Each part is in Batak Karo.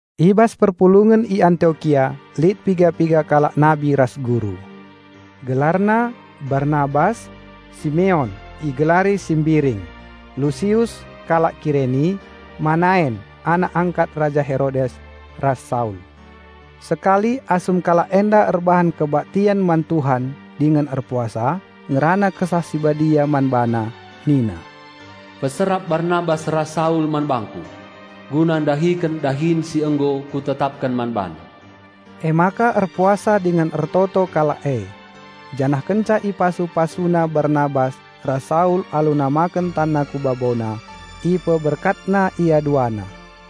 I bas perpulungen i Antiokia lit piga-piga kalak nabi ras guru. Gelarna, Barnabas, Simeon (igelari si Mbiring), Lusius (kalak Kireni), Manaen (anak angkat Raja Herodes) ras Saul. Sekali, asum kalak enda erbahan kebaktian man Tuhan dingen erpuasa, ngerana Kesah Si Badia man bana nina, "Peserap Barnabas ras Saul man bangKu, guna ndahiken dahin si nggo Kutetapken man bana." Emaka erpuasa dingen ertoto kalak e. Janah kenca ipasu-pasuna Barnabas ras Saul alu namaken tanna ku babona, ipeberkatna ia duana.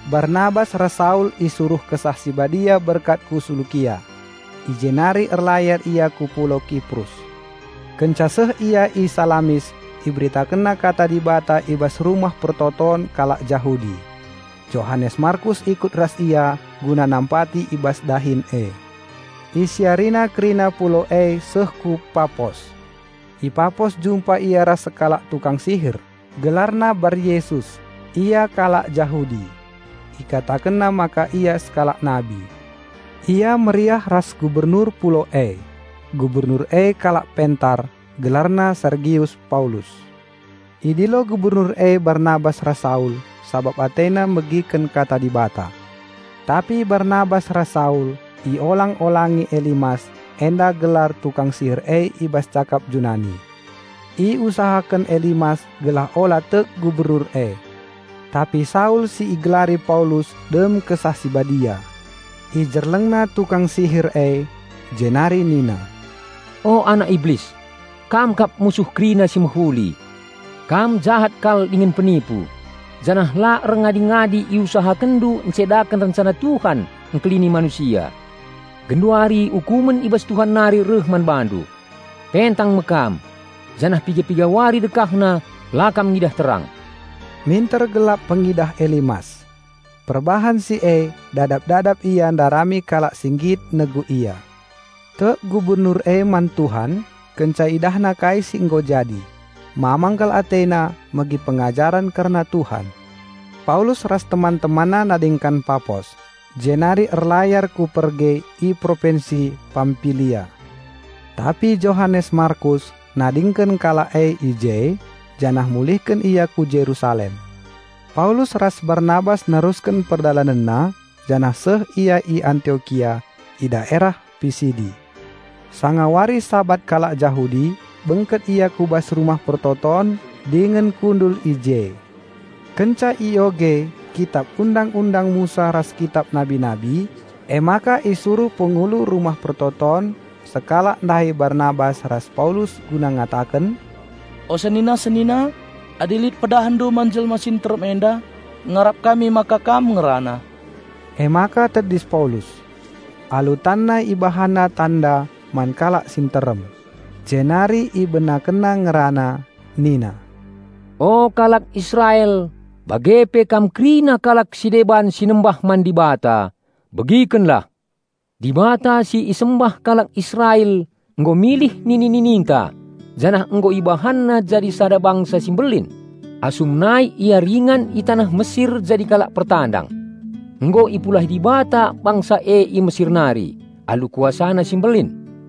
Barnabas ras Saul si isuruh Kesah Si Badia berkat ku Selukia. I jenari erlayar ia ku pulau Kiprus. Kenca seh ia i Salamis iberitakenna Kata Dibata i bas rumah persembahen kalak Jahudi. Johanes Markus ikut ras ia guna nampati i bas dahin e. Isiarina kerina pulau e seh ku Papos. I Papos jumpa ia ras sekalak tukang sihir, gelarna Baryesus. Ia kalak Jahudi. Ikatakenna maka ia sekalak nabi. Ia meriah ras Gubernur pulau e. Gubernur e kalak pentar, gelarna Sergius Paulus. Idilo Gubernur e Barnabas ras Saul sabap atena megiken Kata Dibata. Tapi Barnabas ras Saul iolang-olangi Elimas (enda gelar tukang sihir e i bas cakap Junani). Iusahaken Elimas gelah ula tek Gubernur e. Tapi Saul si igelari Paulus dem Kesah Si Badia. Ijerlengna tukang sihir e. Jenari nina, "O anak Iblis! Kam kap musuh kerina si mehuli! Kam jahat kal dingen penipu, janah la erngadi-ngadi iusahakenndu encedaken rencana Tuhan engkelini manusia. Genduari ukumen i bas Tuhan nari reh man bandu; pentang me kam, janah piga-piga wari dekahna la kam ngidah terang." Minter gelap pengidah Elimas. Perbahan si e dadap-dadap ia ndarami kalak si nggit negu ia. Tek Gubernur e man Tuhan, kenca idahna kai si nggo jadi. Mamang kal atena megi pengajaren kerna Tuhan. Paulus ras teman-temanna nadingken Papos, jenari erlayar ku Perge i propinsi Pampilia. Tapi Johanes Markus nadingken kalak e i je, janah mulihken ia ku Jerusalem. Paulus ras Barnabas nerusken perdalanenna, janah seh ia i Antiokia i daerah Pisidi. Sanga wari Sabat kalak Jahudi bengket ia ku bas rumah persembahen, dingen kundul i je. Kenca ioge kitap Undang-undang Musa ras kitap nabi-nabi, emaka isuruh pengulu rumah persembahen sekalak ndahi Barnabas ras Paulus guna ngataken, "O senina-senina, adi lit pedahndu man jelma si nterem enda, ngarap kami maka kam ngerana." Emaka tedis Paulus. Alu tanna ibahanna tanda man kalak si nterem. Jenari ibenakenna ngerana nina, "O kalak Israel bage pe kam kerina kalak si deban si nembah man Dibata, begikenlah. Dibata si isembah kalak Israel nggo milih nini-nininta janah nggo IbahanNa jadi sada bangsa si mbelin asum nai ia ringan i taneh Mesir jadi kalak pertandang. Nggo ipulahi Dibata bangsa e i Mesir nari alu KuasaNa si mbelin.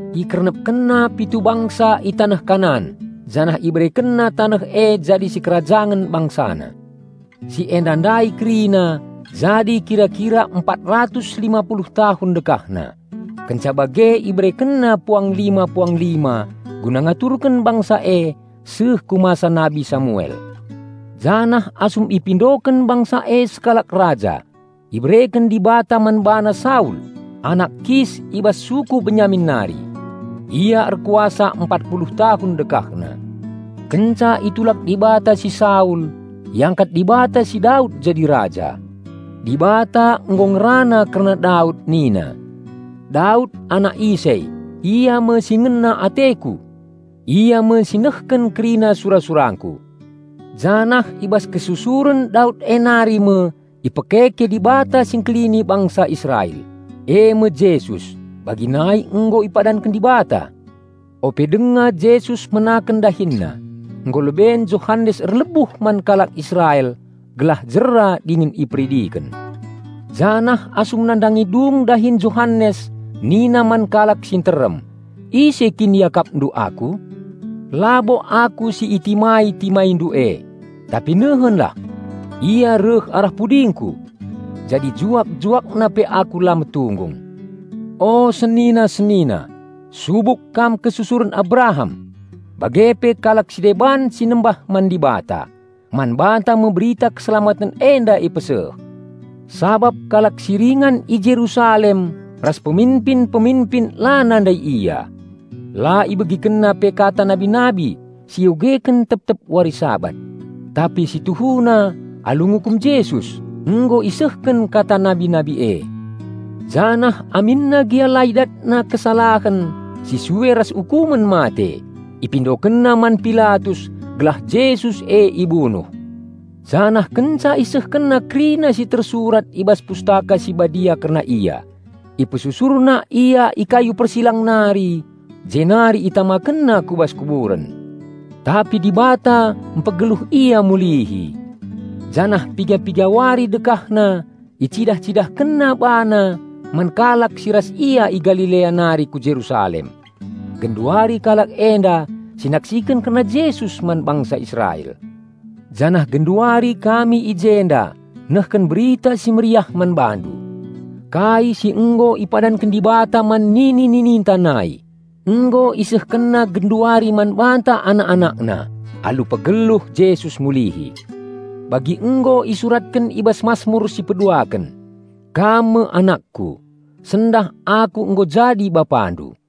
IkernepkenNa pitu bangsa i taneh Kanaan janah IberekenNa taneh e jadi si kerajangen BangsaNa. Si enda ndai kerina jadi kira-kira empat ratus lima puluh tahun dekahna. Kenca bage IberekenNa puanglima-puanglima guna ngaturken bangsa e seh ku masa nabi Samuel. Janah asum ipindoken bangsa e sekalak raja, ibereken Dibata man bana Saul, anak Kis i bas suku Benyamin nari. Ia erkuasa empat puluh tahun dekahna. Kenca itulak Dibata si Saul, iangkat Dibata si Daud jadi raja. Dibata nggo ngerana kerna Daud nina, 'Daud anak Isai, ia me si ngena ateKu. Ia me si nehken kerina sura-surangKu.' Janah i bas kesusuren Daud e nari me ipekeke Dibata si Engkelini bangsa Israel, eme Jesus, bagi nai nggo ipadanken Dibata. Ope denga Jesus menaken DahinNa, nggo leben Johanes erlebuh man kalak Israel gelah jera dingen iperidiken. Janah asum nandangi dung dahin Johanes nina man kalak si nterem, 'Ise kin iakapndu aku? Labo aku si itimai-timaindu e. Tapi nehenlah! Ia reh arah pudingku. Jadi juak-JuakNa pe aku la metunggung.' O senina-senina, subuk kam kesusuren Abraham, bage pe kalak si deban si nembah man Dibata: man banta me berita keselamaten enda ipeseh! Sabap kalak si ringan i Jerusalem ras peminpin-peminpin la nandai Ia. La ibegikenna pe kata nabi-nabi si iogeken tep-tep wari Sabat. Tapi si tuhuna alu ngukum Jesus, nggo isehken kata nabi-nabi e. Janah aminna gia la idatna kesalahen si sue ras ukumen mate, ipindokenna man Pilatus gelah Jesus e ibunuh. Janah kenca isehkenna kerina si tersurat i bas Pustaka Si Badia kerna Ia, ipesusurna Ia i kayu persilang nari jenari itamakenna ku bas kuburen. Tapi Dibata mpegeluh Ia mulihi. Janah piga-piga wari dekahna icidah-CidahkenNa BaNa man kalak si ras Ia i Galilea nari ku Jerusalem. Genduari kalak enda si naksiken kerna Jesus man bangsa Israel. Janah genduari kami i jenda nehken Berita Si Mehuli man bandu. Kai si nggo ipadanken Dibata man nini-nininta nai, nggo IsehkenNa genduari man banta anak-anakna alu pegeluh Jesus mulihi. Bagi nggo isuratken i bas Masmur si peduaken, 'Kam me AnakKu; sendah Aku nggo jadi BapaNdu.'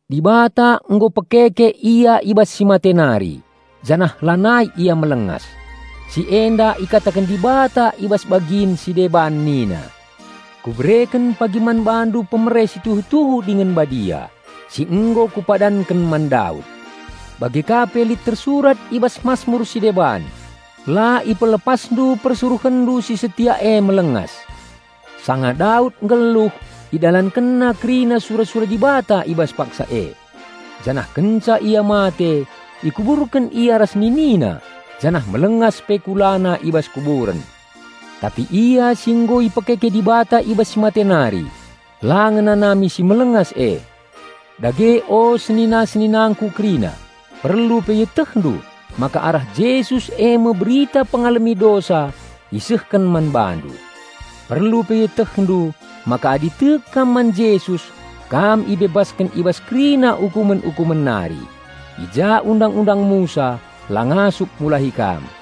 Dibata nggo pekeke Ia i bas si mate nari janah lanai Ia melengas. Si enda ikataken Dibata i bas bagin si deban nina, 'Kubereken pagi man bandu pemere si tuhu-tuhu dingen badia, si nggo Kupadanken man Daud.' Bage ka pe lit tersurat i bas masmur si deban, 'La IpelepasNdu PersuruhenNdu si setia e melengas.' Sanga Daud nggeluh, idalankenna kerina sura-sura Dibata i bas paksa e. Janah kenca ia mate, ikuburken ia ras ninina janah melengas pe kulana i bas kuburen. Tapi Ia si nggo ipekeke Dibata i bas si mate nari, la ngenanami si melengas e. Dage o senina-seninangku kerina, perlu pe ietehndu maka arah Jesus eme berita pengalemi dosa isehken man bandu. Perlu pe ietehndu maka adi tek kam man Jesus kam ibebasken i bas kerina ukumen-ukumen nari, i ja Undang-undang Musa la ngasup mulahi kam.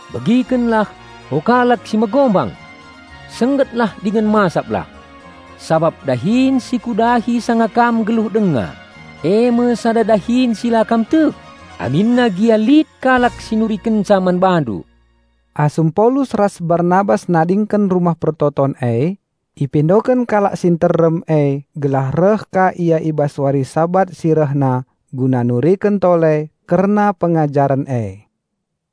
'Begikenlah, o kalak si megombang! Senggetlah dingen masaplah! Sabap dahin si kudahi sanga kam nggeluh denga eme sada dahin si la kam tek aminna gia lit kalak si nurikenca man bandu!'" Asum Paulus ras Barnabas nadingken rumah persembahen e, ipindoken kalak si nterem e gelah reh ka ia i bas wari Sabat si rehna guna nuriken tole kerna pengajaren e.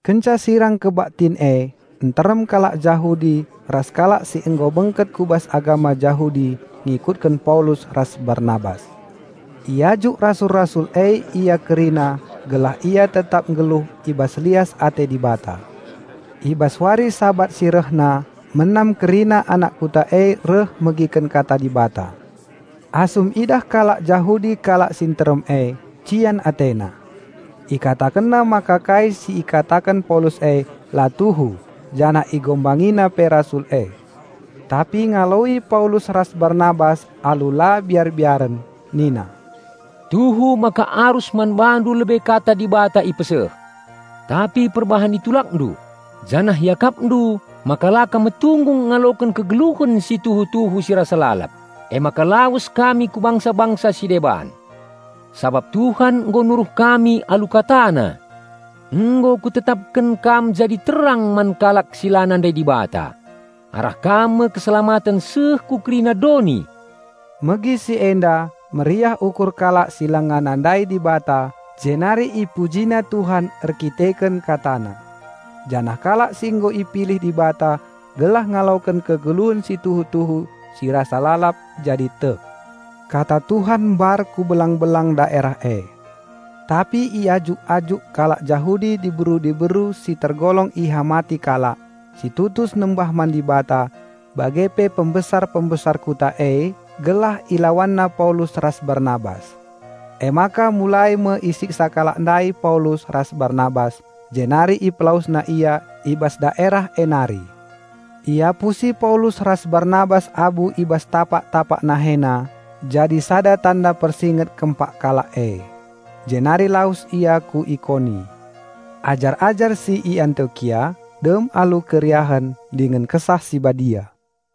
Kenca sirang kebaktin e, nterem kalak Jahudi ras kalak si nggo bengket ku bas agama Jahudi ngikutken Paulus ras Barnabas. Iajuk rasul-rasul e ia kerina gelah ia tetap nggeluh i bas lias ate Dibata. I bas wari Sabat si rehna menam kerina anak kuta e reh megiken kata Dibata. Asum idah kalak Jahudi kalak si nterem e, cian atena. Ikatakenna maka kai si ikataken Paulus e la tuhu janah ihinana pe rasul e. Tapi ngaloi Paulus ras Barnabas alu la biar-biaren nina, "Tuhu maka arus man bandu lebe Kata Dibata ipeseh. Tapi perbahan itulakndu, janah iakapndu maka la kam metunggung ngaloken kegeluhen si tuhu-tuhu si rasa lalap, emaka lawes kami ku bangsa-bangsa si deban. Sabap Tuhan nggo nuruh kami alu KataNa, 'Nggo kutetapken kam jadi terang man kalak si la nandai Dibata, arah kam me keselamaten seh ku kerina doni!'" Megi si enda meriah ukur kalak si langa nandai Dibata jenari ipujina Tuhan erkiteken KataNa. Janah kalak si nggo ipilih Dibata gelah ngaloken kegeluhen si tuhu-tuhu si rasa lalap, jadi tek. Kata Tuhan mbar ku belang-belang daerah e. Tapi iajuk-ajuk kalak Jahudi diberu-diberu si tergolong ihamati kalak, si tutus nembah man Dibata, bage pe pembesar-pembesar kuta e, gelah ilawanna Paulus ras Barnabas. Emaka mulai me isiksa kalak ndai Paulus ras Barnabas jenari ipelawesna ia i bas daerah e nari. Iapusi Paulus ras Barnabas abu i bas tapak-tapak nahena jadi sada tanda persinget kempak kalak e. Jenari lawes ia ku Ikoni. Ajar-ajar si i Antiokia dem alu keriahen dingen Kesah Si Badia.